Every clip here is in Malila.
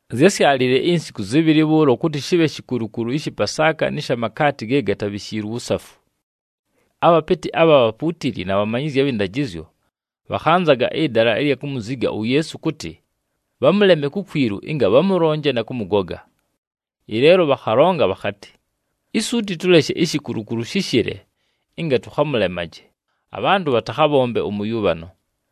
Zyásyalile insiku zɨbhɨlɨ bhʉʉlo kʉtɨ shɨbhe shikulukulu ɨshɨ Pasaaka nɨ sha makaati ge gatabhishiilwe uwusafu. Abhapɨtɨ abha bhapuutili na bhamanyizyi abhɨ ndajɨzyo, bhakhanzaga ɨdala ɨlya kumuziga uYeesu kʉtɨ, bhamʉleme kukwilu ɨnga bhamʉlonje na kʉmʉgoga. Ɨleelo bhakhalonga bhakhatɨ, “Isuuti tʉleshe ishikulukulu shɨshɨle ɨnga tʉkhamʉlemaje, abhantʉ bhatakhabhombe ʉmʉyʉbhano.”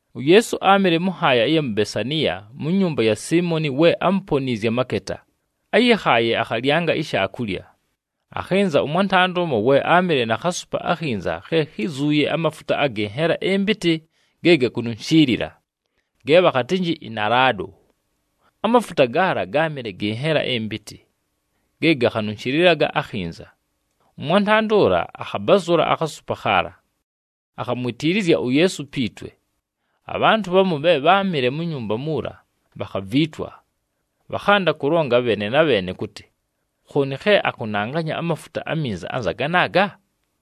UYeesu áamɨle mʉ nhaaya ɨya mu Besaniya, mu nyumba ya Siimoni we ámuponiizye amaketa, áyɨkhaaye akhalyanga ishaakulya. Akhɨnza ʉmwantanda ʉmo we áamɨle na khasupa akhinza khe khízuuye amafuta agɨ nhela ɨmpɨtɨ ge gakununshiilila, ge bhakhatɨnjɨ ɨnalaado. Amafuta gaala gáamɨle gɨ nhela ɨmpɨtɨ, ge gakhanunshilaga akhinza. Ʉmwantanda ʉla akhabazʉla akhasupa khaala, akhamwitiilizya uYeesu pi twe. Abhantʉ bhamu bhe bháamɨle mu nyumba muula, bhakhaviitwa. Bhakhanda kʉlonga bheene na bheene kʉtɨ, “Khooni khe akʉnanganya amafuta aminza anza ganaaga?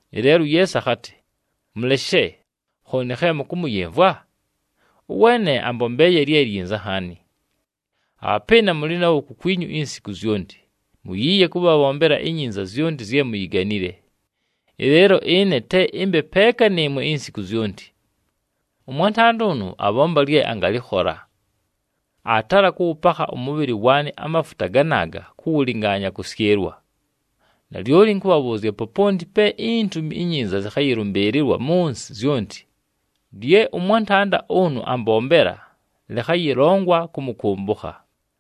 Ɨleelo uYeesu akhatɨ, “Mʉleshe, khooni khe mʉkʉmʉyɨmvwa? Ʉweene ambombeeye lye lyinza nhaani. Abhapɨɨna mʉlɨ nabho kukwinyu insiku zyonti, muyiiye kʉbhabhombela inyinza zyonti zye muyiganile. Ɨleelo ɨne te ɨmbe peeka nɨɨmwe insiku zyonti. Ʉmwantanda ʉnʉ abhomba lye angalɨkhola. Aatala kʉwʉpakha ʉmʉbhɨlɨ waanɨ amafuta ganaaga kʉwʉlɨngaanya kʉsyɨlwa. Nalyoli ɨnkʉbhabhʉʉzya, poponti pe iNtumi iNyinza zɨkhayɨlʉmbɨɨlɨlwa mʉ nsɨ zyonti, lye ʉmwantanda ʉnʉ ambombela lɨkhayɨlongwa kʉmʉkʉmbʉkha.”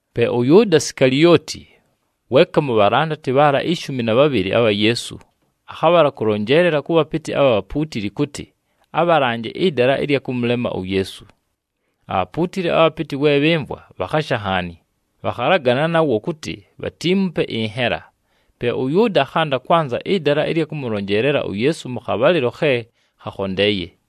Pe ʉYʉʉda Sikalioti, weeka mu bhalandati bhaala ishumi na bhabhɨlɨ abha Yeesu, akhabhala kʉlonjeelela kʉ bhapɨtɨ abha bhapuutili kʉtɨ, abhalanje ɨdala ɨlya kʉmʉlema uYeesu. Abhapuutili abhapɨtɨ we bhɨmvwa, bhakhasha nhaani. Bhakhalagana nawo kʉtɨ bhatiimupe ɨnhela. Pe ʉYʉʉda akhanda kwanza ɨdala ɨlya kʉmʉlonjeelela uYeesu mʉ khabhalɨlo khe khakhondeeye.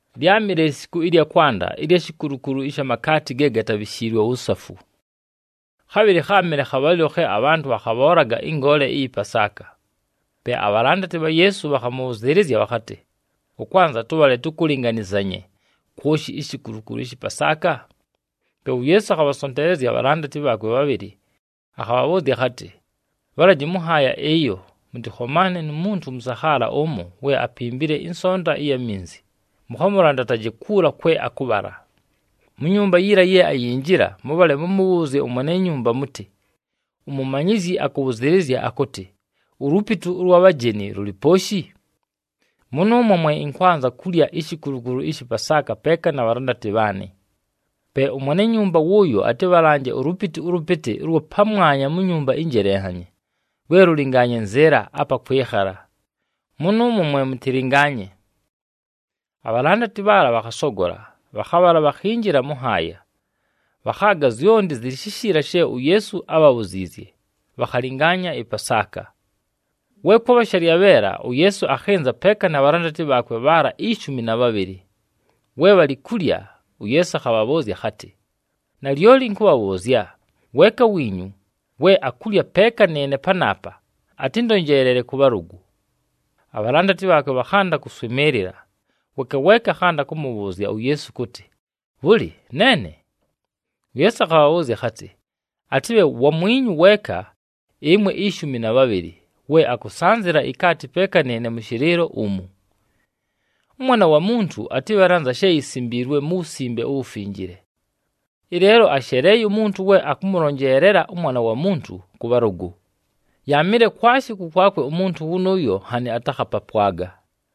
Lyámɨle lisiku ɨlya kwanda ɨlya shikulukulu ɨsha makaati ge gatabhishiilwe uwusafu. Khabhɨlɨ kháamɨle khabhalɨlo khe abhantʉ bhakhabhoolaga ɨngoole ɨyɨ Pasaaka. Pe abhalandati bha Yeesu bhakhamʉbhʉzɨɨlɨzya bhakhatɨ, “Ʉkwanza tʉbhale tʉkʉlɨnganɨzanye kwoshi ishikulukulu ɨshɨ Pasaaka?” Pe uYeesu akhabhasonteelezya abhalandati bhaakwe bhabhɨlɨ. Akhabhabhʉʉzya akhatɨ, “Bhalaji mʉ nhaaya ɨyo, mʉtɨkhomaane nu muntu ʉmʉsakhaala ʉmo we apimbile ɨnsonta ɨya minzi, mʉkhamʉlandataje kuula kwe akʉbhala. Mu nyumba yiila ye ayinjila, mʉbhale mʉmʉbhʉʉzye ʉmwene nyumba mʉtɨ, ‘UMumanyizyi akʉbhʉzɨɨlɨzya akʉtɨ, ulupitu ʉlwa bhajeni lʉlɨ pooshi? Mʉnʉʉmwo mwe ɨnkwanza kulya ishikulukulu ɨshɨ Pasaaka peeka na bhalandati bhaanɨ.’ Pe ʉmwene nyumba wʉʉyo atɨbhalanje ulupitu ʉlʉpɨtɨ ʉlwa pamwanya mu nyumba ɨnjelenhanye, lwe lʉlɨngaanye nzɨɨla apa kwɨkhala. Mʉnʉʉmwo mwe mʉtɨlɨngaanye.” Abhalandati bhaala bhakhasogola, bhakhabhala bhakhinjila mʉ nhaaya. Bhakhaaga zyonti zɨlɨ shishiila she uYeesu ábhabhuziizye, bhakhalɨngaanya ɨPasaaka. We kwabha shalyabheela, uYeesu akhɨnza peeka na bhalandati bhaakwe bhaala ishumi na bhabhɨlɨ. We bhalɨ kulya, uYeesu akhabhabhʉʉzya akhatɨ, “Nalyoli ɨnkʉbhabhʉʉzya, weeka wiinyu we akulya peeka nɨɨne panaapa, atɨndonjeelele kʉ bhalʉgʉ.” Abhalandati bhaakwe bhakhanda kʉswɨmɨɨlɨla, weeka weeka akhanda kʉmʉbhʉʉzya uYeesu kʉtɨ, “Bhʉlɨ, neene?” UYeesu akhabhabhʉʉzya akhatɨ, “Atɨbhe wamwinyu weeka ɨmwe ishumi na bhabhɨlɨ, we akʉsanzɨla ikaati peeka nɨɨne mʉ shɨlɨɨlo umu. ɄMwana wa Muntu atɨbhale anza she yisimbiilwe mu Wusimbe uWufinjile. Ɨleelo asheleeye umuntu we akʉmʉlonjeelela ʉMwana wa Muntu kʉ bhalʉgʉ! Yaamɨle kwashi kʉkwakwe umuntu wʉnʉʉyo nhanɨ atakhapapwaga.”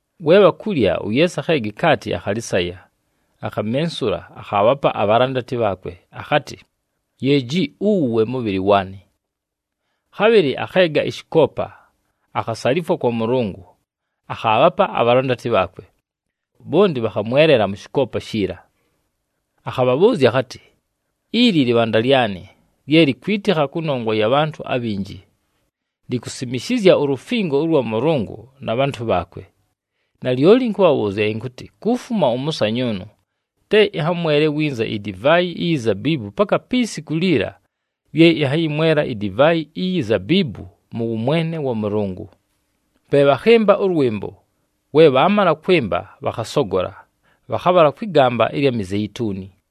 We bhakulya, uYeesu akheega ikaati, akhalɨsaya, akhamensula, akhaabhapa abhalandati bhaakwe, akhatɨ, “Yeeji, uwu we mʉbhɨlɨ waanɨ.” Khabhɨlɨ akheega ɨshɨkoopa, akhasalifwa kwa Mʉlʉngʉ, akhaabhapa abhalandati bhaakwe, bhonti bhakhamwelela mʉ shɨkoopa shiila. Akhabhabhʉʉzya akhatɨ, “Ili lɨbhanda lyanɨ lye likwitikha kʉnongwa ya bhantʉ abhinji, likusimishizya ulufingo ʉlwa Mʉlʉngʉ na bhantʉ bhaakwe. Nalyoli ɨnkʉbhabhʉʉzya ɨnkʉtɨ, kufuma ʉmʉsanyʉʉnʉ, te ɨnhamwele winza idivaayi iyi zabiibu paka pi siku liila lye ɨnhayɨmwela idivaayi iyi zabiibu mʉ wʉmwene wa Mʉlʉngʉ.” Pe bhakhɨmba ʉlwɨmbo. We bhaamala kwɨmba, bhakhasogola, bhakhabhala kwɨ gamba ɨlya Mizeituni.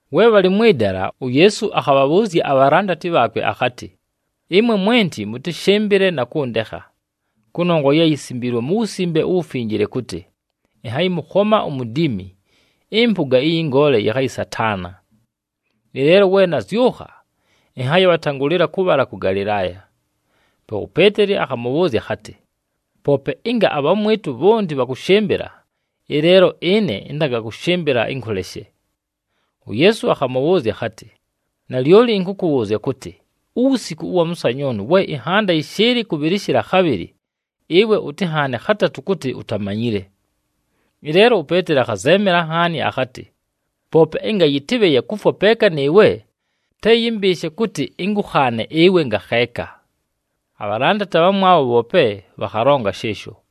We bhalɨ mwɨ dala, uYeesu akhabhabhʉʉzya abhalandati bhaakwe akhatɨ, “Ɨmwe mwenti mʉtɨshɨmbɨle na kʉndekha. Kʉnongwa ye yisimbiilwe mu Wusimbe uWufinjile kʉtɨ, ‘Ɨnhayɨmʉkhoma umudiimi, ɨmpʉga ɨyɨ ngoole yɨkhayɨsataana.’ “Ɨleelo we nazyʉkha, ɨnhayɨbhatangʉlɨla kʉbhala kʉ Galɨlaaya.” Pe uPeeteli akhamʉbhʉʉzya akhatɨ, “Poope ɨnga abhamwɨtʉ bhonti bhakʉshɨmbɨla, ɨleelo ɨne ɨntangakʉshɨmbɨla ɨnkʉleshe.” UYeesu akhamʉbhʉʉzya akhatɨ, “Nalyoli ɨnkʉkʉbhʉʉzya kʉtɨ, uwusiku ʉwa mʉsanyʉʉnʉ, we ɨnhanda yɨshɨɨlɨ kʉbhɨlɨshɨla khabhɨlɨ, ɨwe ʉtɨnhaane khatatʉ kʉtɨ utamanyile.” Ɨleelo uPeeteli akhazeemela nhaani akhatɨ, “Poope ɨnga yɨtɨbhe ya kufwa peeka nɨɨwe, te yɨmbɨɨshe kʉtɨ ɨnkʉkhaane ɨwe ngakheeka.” Abhalandati abhamwabho bhoope bhakhalonga shɨɨsho.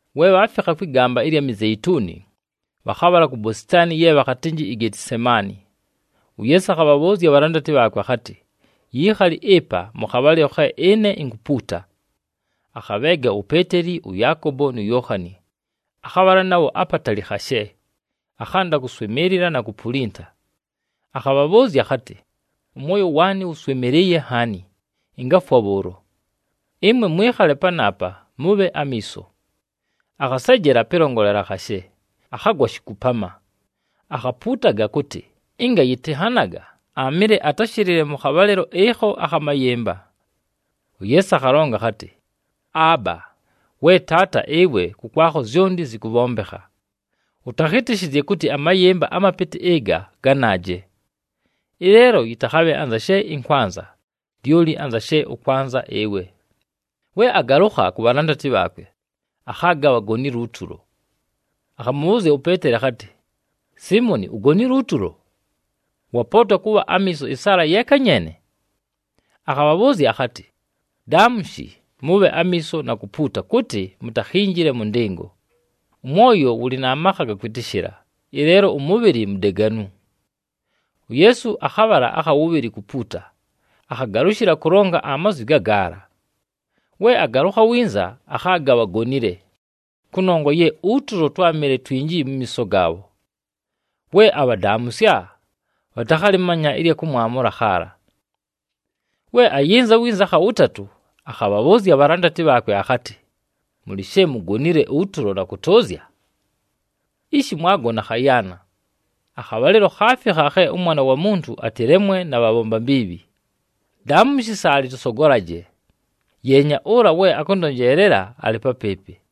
We bhaafikha kwɨ gamba ɨlya Mizeituni, bhakhabhala ku bositaani ye bhakhatɨnjɨ iGetisemaani. UYeesu akhabhabhʉʉzya abhalandati bhaakwe akhatɨ, “Yiikhali ɨpa, mʉ khabhalɨlo khe ɨne inkupuuta.” Akhabheega uPeeteli, ʉYaakobo nu Yookhani, akhabhala nabho apatali khashe, akhanda kʉswɨmɨɨlɨla na kupulinta. Akhabhabhʉʉzya akhatɨ, “Ʉmwoyo waanɨ wʉswɨmɨlɨɨye nhaani, ɨngafwa bhʉʉlo. Ɨmwe mwɨkhale panaapa, mʉbhe amiiso.” Akhasejela pɨlongolela khashe, akhagwa shikupama. Akhapuutaga kʉtɨ, ɨnga yɨtɨnhanaga, aamɨle atashɨlɨle mʉ khabhalɨlo ɨkho akha mayɨmba. UYeesu akhalonga akhatɨ, “Aaba, we Taata, ɨwe kʉkwakho zyonti zɨkʉbhombekha. Ʉtakhɨtɨshɨzye kʉtɨ amayɨmba amapɨtɨ ɨga ganaaje! Ɨleelo yɨtakhabhe anza she ɨnkwanza, lyoli anza she ʉkwanza ɨwe.” We agalʉkha ku bhalandati bhaakwe, akhaaga bhagonile utulo. Akhamʉbhʉʉzya uPeeteli akhatɨ, “Siimoni, ugonile utulo? Wapootwa kʉbha amiiso ɨsaala yeeka nyeene?” Akhabhabhʉʉzya akhatɨ, “Daamushi, mʉbhe amiiso na kupuuta kʉtɨ mutakhinjile mʉ ndɨngo. Ʉmwoyo wʉlɨ na makha aga kwɨtɨshɨla, ɨleelo ʉmʉbhɨlɨ mudeganu.” UYeesu akhabhala akha wʉbhɨlɨ kupuuta, akhagalʉshɨla kʉlonga amazwi gagaala. We agalʉkha winza, akhaaga bhagonile, kʉnongwa ye utulo twámɨle twinji mu miiso gaabho. We abhadaamʉsya, bhatakhalɨmanya ɨlya kʉmwamʉla khaala. We ayɨnza winza akha wʉtatʉ, akhabhabhʉʉzya abhalandati bhaakwe akhatɨ, “Mʉlɨ she mugonile utulo na kʉtʉʉzya? Ishi mwagona khayaana. Akhabhalɨlo khaafikha khe ʉMwana wa Muntu atɨlemwe na bhabhomba mbiibhi. Daamushi, saalɨ tʉsogolaje! Yeenya, ʉla we akʉndonjeelela alɨ papɨɨpɨ.”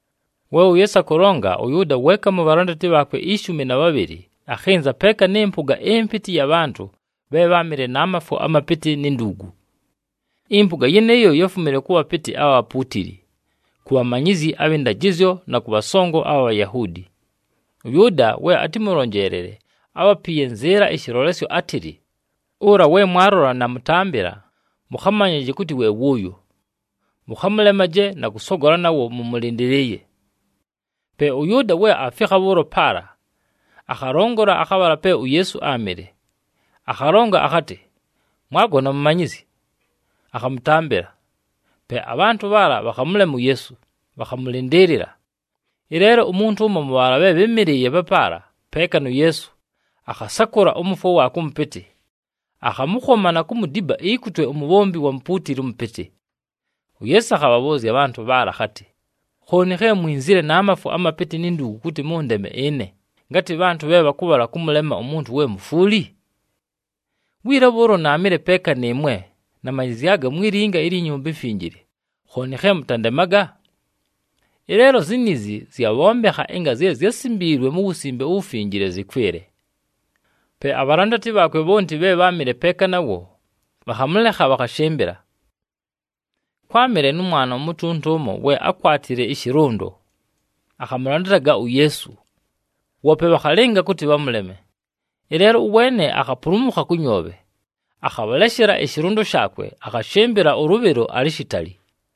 We uYeesu akʉlonga, ʉYʉʉda, weeka mu bhalandati bhaakwe ishumi na bhabhɨlɨ, akhɨnza peeka nɨ mpʉga ɨmpɨtɨ ɨya bhantʉ bhe bháamɨle na mafwo amapɨtɨ ni nduugu. Ɨmpʉga yɨnɨɨyo yáfumile kʉ bhapɨtɨ abha bhapuutili, ku bhamanyizyi abhɨ ndajɨzyo na kʉ bhasongo abha Bhayahuudi. ɄYʉʉda we atɨmʉlonjeelele, ábhapiiye nzɨɨla ɨshɨlolesyo átɨlɨ, “Ʉla we mwalola namʉtambɨla, mʉkhamanyaje kʉtɨ we wʉʉyo. Mʉkhamʉlemaje na kʉsogola nawo mʉmʉlɨndɨlɨɨye.” Pe ʉYʉʉda we aafikha bhʉʉlo paala, akhalongola akhabhala pe uYeesu áamɨle, akhalonga akhatɨ, “Mwagona Mumanyizyi!” Akhamʉtambɨla. Pe abhantʉ bhaala bhakhamʉlema uYeesu, bhakhamʉlɨndɨɨlɨla. Ɨleelo umuntu ʉmo mʉ bhaala bhe bhɨ́mɨlɨɨye papaala peeka nu Yeesu, akhasakʉla ʉmʉfwo waakwe ʉmʉpɨtɨ, akhamʉkhoma na kumudiba ikutwe umubhombi wa mupuutili ʉmʉpɨtɨ. UYeesu akhabhabhʉʉzya abhantʉ bhaala akhatɨ, “Khooni khe mwinzile na mafwo amapɨtɨ ni nduugu kʉtɨ mʉndeme ɨne, ngatɨ bhantʉ bhe bhakʉbhala kʉmʉlema umuntu we mufwuli? Wiila bhʉʉlo naamɨle peeka nɨɨmwe, namanyɨzyaga mwi linga ilyi Nyumba iMfinjile, khooni khe mʉtandemaga? Ɨleelo ziniizi zyabhombekha ɨnga zye zyásimbiilwe mu Wusimbe uWufinjile zɨkwɨle.” Pe abhalandati bhaakwe bhonti bhe bháamɨle peeka nawo, bhakhamʉlekha, bhakhashɨmbɨla. Kwámɨle nʉ mwana umutunta ʉmo we ákwatile ɨshɨlʉndo, akhamʉlandataga uYeesu. Woope bhakhalɨnga kʉtɨ bhamʉleme. Ɨleelo ʉweene akhapulumukha kʉ nyoobhe, akhabhaleshela ɨshɨlʉndo shaakwe, akhashɨmbɨla ʉlʉbhɨlo alɨ shitali.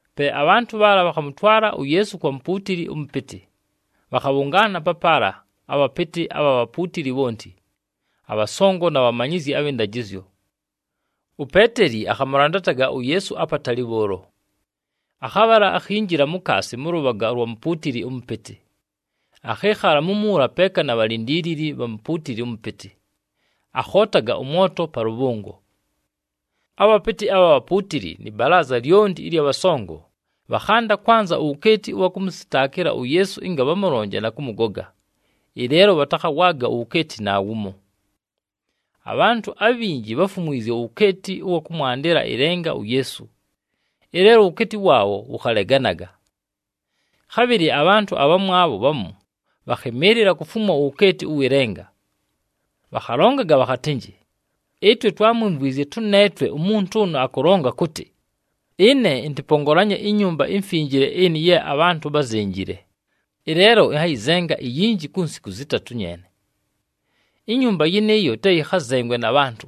Pe abhantʉ bhaala bhakhamʉtwala uYeesu kwa mupuutili ʉmʉpɨtɨ. Bhakhabhʉngaana papaala abhapɨtɨ abha bhapuutili bhonti, abhasongo, na bhamanyizyi abhɨ ndajɨzyo. UPeeteli akhamʉlandataga uYeesu apatali bhʉʉlo. Akhabhala, akhinjila mukaasi mʉ lʉbhaga lwa mupuutili ʉmʉpɨtɨ. Akhɨɨkhala mumuula peeka na bhalindiilili bha mupuutili ʉmʉpɨtɨ, akhootaga ʉmwoto pa lʉbhʉngo. Abhapɨtɨ abha bhapuutili nɨ balaaza lyonti ɨlya bhasongo, bhakhanda kwanza uwukeeti ʉwa kʉmʉsɨtaakɨla uYeesu ɨnga bhamʉlonje na kʉmʉgoga, ɨleelo bhatakhawaaga uwukeeti naawumo. Abhantʉ abhinji bháfumwizye uwukeeti ʉwa kʉmwandɨla ɨlenga uYeesu, ɨleelo uwukeeti waabho wʉkhaleganaga. Khabhɨlɨ abhantʉ abhamwabho bhamu bhakhɨmɨɨlɨla kufumwa uwukeeti ʉwɨ lenga. Bhakhalongaga bhakhatɨnjɨ, “Ɨtwe twámwimvwizye tʉneetwe umuntu ʉnʉ akʉlonga akʉtɨ, ‘Ɨne ɨntɨpongolanye iNyumba iMfinjile ɨnɨ ye abhantʉ bházenjile. Ɨleelo ɨnhayɨzenga iyinji ku nsiku zɨtatʉ nyeene. Inyumba yɨnɨɨyo te yɨkhazengwe na bhantʉ.’”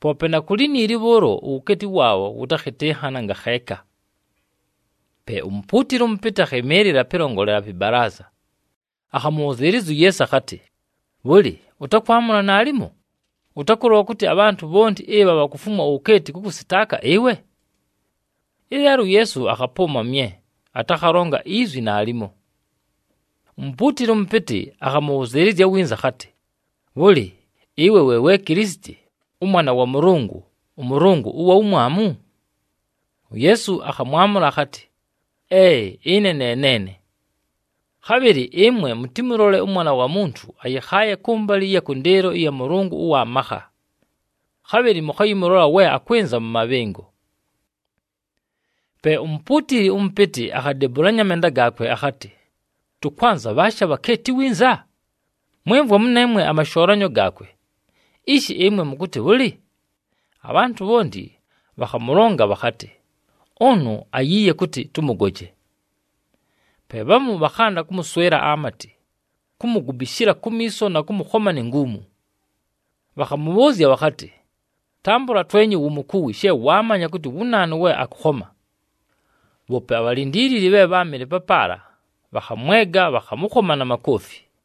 Poope na ku liniili bhʉʉlo, uwukeeti waabho wʉtakhɨtɨnhana ngakheeka. Pe umupuutili ʉmʉpɨtɨ akhɨmɨɨlɨla pɨlongolela pɨ balaaza. Akhamʉbhʉzɨɨlɨzya uYeesu akhatɨ, “Bhʉlɨ, ʉtakwamʉla naalimo? Ʉtakʉlola kʉtɨ abhantʉ bhonti ɨbha bhakufumwa uwukeeti kʉkʉsɨtaaka ɨwe?” Ɨleelo uYeesu akhapʉʉma mye, atakhalonga izwi naalimo. Umupuutili ʉmʉpɨtɨ akhamʉbhʉzɨɨlɨzya winza akhatɨ, “Bhʉlɨ, ɨwe we we Kilisiti, ʉMwana wa Mʉlʉngʉ, ʉMʉlʉngʉ ʉwa Wumwamu?” UYeesu akhamwamʉla akhatɨ, “Ee! Ɨne ne neene. Khabhɨlɨ ɨmwe mʉtɨmʉlole ʉMwana wa Muntu ayɨkhaaye kʉmbalɨ ɨya kʉndɨɨlo ɨya Mʉlʉngʉ ʉwa makha. Khabhɨlɨ mʉkhayɨmʉlola we akwɨnza mʉ mabhɨngo.” Pe umupuutili ʉmʉpɨtɨ akhadebulanya amenda gaakwe akhatɨ, “Tʉkwanza bhaashi abhakeeti winza? Mwɨmvwa mʉneemwe amashoolanyo gaakwe! Ishi ɨmwe, mʉkʉtɨ bhʉlɨ?” Abhantʉ bhonti bhakhamʉlonga bhakhatɨ, “Ʉnʉ ayiiye kʉtɨ tʉmʉgoje.” Pe bhamu bhakhanda kʉmʉswɨla amatɨ, kumugubishila kumiiso na kʉmʉkhoma ni nguumu. Bhakhamʉbhʉʉzya bhakhatɨ, “Tambʉla twenye wumukuwi she waamanya kʉtɨ wu naanu we akʉkhoma!” Bhoope abhalindiilili bhe bháamɨle papaala, bhakhamwega, bhakhamʉkhoma na makoofi.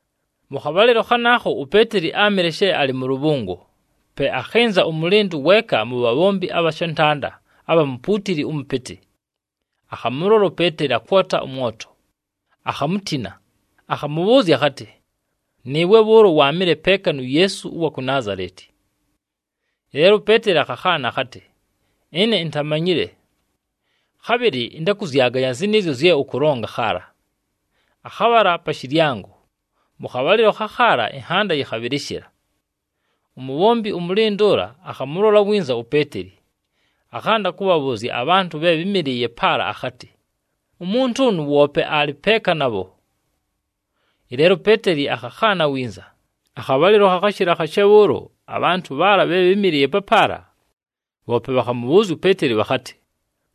Mʉ khabhalɨlo khanaakho, uPeeteli áamɨle she alɨ mʉ lʉbhʉngo. Pe akhɨnza ʉmʉlɨndʉ weeka mu bhabhombi abha shantanda abha mupuutili ʉmʉpɨtɨ. Akhamʉlola uPeeteli akwota ʉmwoto, akhamutina. Akhamʉbhʉʉzya akhatɨ, “Nɨɨwe bhʉʉlo waamɨle peeka nu Yeesu ʉwa ku Naazaleti.” Ɨleelo uPeeteli akhakhaana akhatɨ, “Ɨne intamanyile. Khabhɨlɨ ɨntakʉzyaganya zɨnɨɨzyo zye ʉkʉlonga khaala!” Akhabhala pa shɨlyango. Mʉ khabhalɨlo khakhaala, ɨnhanda yɨkhabhɨlɨshɨla. Umubhombi ʉmʉlɨndʉ ʉla akhamʉlola winza uPeeteli, akhanda kʉbhabhʉʉzya abhantʉ bhe bhɨ́mɨlɨɨye paala akhatɨ, “Umuntu ʉnʉ woope alɨ peeka nabho.” Ɨleelo uPeeteli akhakhaana winza. Akhabhalɨlo khakhashɨla khashe bhʉʉlo, abhantʉ bhaala bhe bhɨ́mɨlɨɨye papaala, bhoope bhakhamʉbhʉʉzya uPeeteli bhakhatɨ,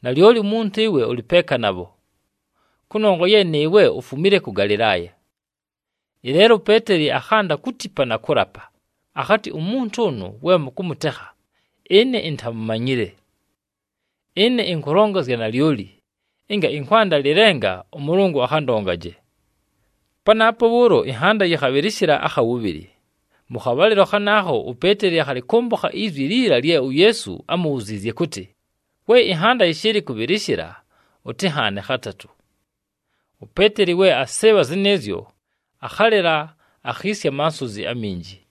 “Nalyoli wumuntu ɨwe ʉlɨ peeka nabho, kʉnongwa ye nɨɨwe ufumile kʉ Galɨlaaya.” Ɨleelo uPeeteli akhanda kutipa na kʉlapa, akhatɨ, “Umuntu ʉnʉ we mʉkʉmʉtekha, ɨne intamumanyile. Ɨne ɨnkʉlonga zya nalyoli, ɨnga ɨnkwanda lɨlenga, ʉMʉlʉngʉ akhandongaje!” Panaapo bhʉʉlo, ɨnhanda yɨkhabhɨlɨshɨla akha wʉbhɨlɨ. Mʉ khabhalɨlo khanaakho, uPeeteli akhalɨkʉmbʉkha izwi liila lye uYeesu ámubhuziizye kʉtɨ, “We ɨnhanda yɨshɨɨlɨ kʉbhɨlɨshɨla, ʉtɨnhaane khatatʉ.” UPeeteli we asɨɨbha zɨnɨɨzyo, akhalɨla, akhiisya amasonzi aminji.